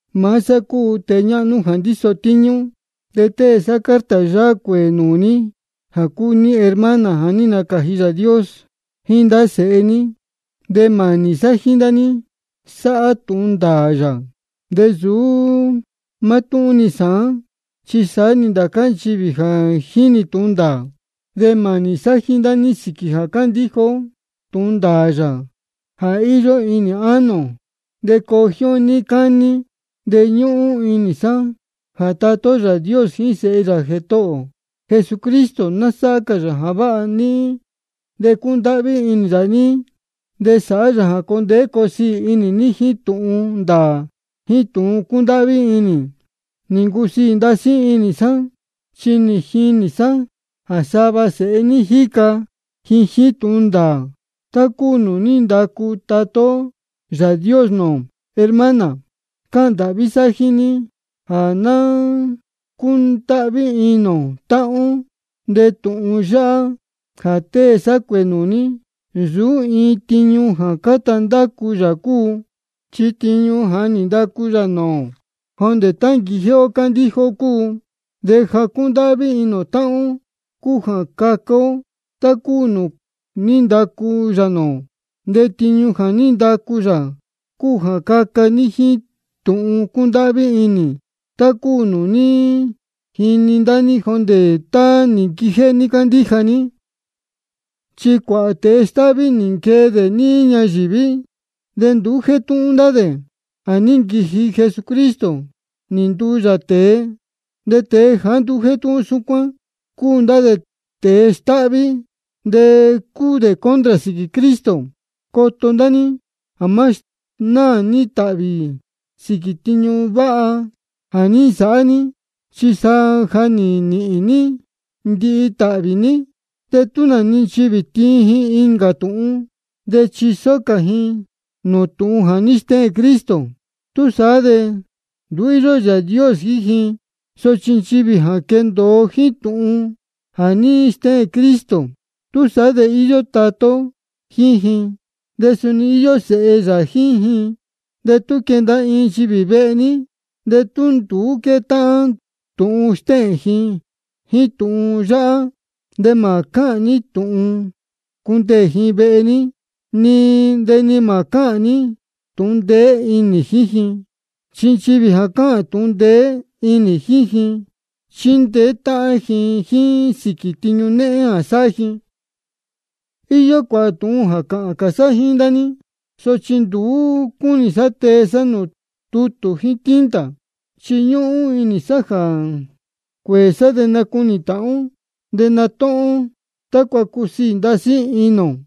Maá sá cúu tēe ñáhnú jā ndíso tíñú, de tée sá carta yáhá cuēē nūū ní jā cúu ní hermana jā ní nacāji Yāā Dios, jíín nūū ndá sēhe ní. De mānī sá jíín ndá ní sáhá tūhun ndāā yā, de nsūú mátúhún-ni sāán, chi saá-ni ndācá nchivī jínī tūhun ndāā. De mānī sá jíín ndá ní sīquī jā cándíja ó tūhun ndāā yā jā íyó inī ánō ō, de coo jíín ó níí cání. De ñúhún inī sá jā Tatá ó Yāā Dios jíín Sēhe yā Jētohō ō Jesucristo, ná sáhá cā yā jā váha níhín, de cundáhví inī yā níhín, de sāhá yā jā coo ndeé coo siī inī ní, jíín tūhun ndāā jíín tūhun cúndáhví inī. Nī ncusiī ndasí inī sá, chi nī jinī sá jā sava sēhe ní jíca ji jíín tūhun ndāā, tá cúu nūū ní ndacu maá Tatá ó Yāā Dios nūū ō. Hermana, cáhān ndāhví sá jíín ní jā ná cúndáhví inī ō táhán ó. De tūhun yáhá jā tée sá cuēē nūū ní, nsūú iin tiñu jéé jā cáta ndácu yā cúu, chi tiñu jā ní ndacu yā nūū ō jondē tá nī nquijéhé ó cándíja ó cúu. De jā cúndáhví inī ō táhán ó cúu jā caca ó tá cúu nūū ní ndacu yā nūū ō. De tiñu jā ní ndacu yā cúu jā caca ní jíín tūhun cúndáhví inī, tá cúu nūū ní jini ndá ní jondē tá nī nquijéhé ní cándíja ní. Chi cuāhā tēe stáhví nī nquee dē níí ñayīví, de nduú jétúhún ndá dē jā ní nquiji Jesucristo nī nduu yā tēe. De tēe jāá nduú jétúhún súcuán, cúu ndá dē tēe stáhví, de cúu dē contra sīquī Cristo. Coto ndá ní jā má snáā ní tāhvī sīquī tiñu váha jā ní nsāhá ní, chi sa jā ná níhīn ní ndihi tāhvī ní. De tú nā-ni nchivī tiin ji incā tūhun, de chisó cā ji nūū tūhun jā ní stéhēn Cristo, túsaá de nduú íyó Yāā Dios jíín ji. Sochi nchivī jā quéndōo jíín tūhun jā ní stéhēn Cristo, túsaá de íyó Tatá ó jíín ji, de suni íyó Sēhe yā jíín ji. De tú quenda iin nchivī vehe ní, de tú nduú quétáhán tūhun stéhēn ji jíín tūhun yáhá, de mā cuáha ní tūhun cundeē ji vehe ní, de ni mā cáhān ní tūhun ndeé inī jíín ji. Chi nchivī jā cáhān tūhun ndeé inī jíín ji, chíndeé táhán jíín ji sīquī tiñu néhén jā sáhá ji. Iyó cuāhā tūhun jā cāhān cā sá jíín ndá ní, sochi nduú cúnī sá tee sá nūū tútū jíín tinta. Chi ñúhún inī sá jā cuēē sá de nacunī tāhán ó, de natúhún ó, tácua cusiī ndasí inī ō.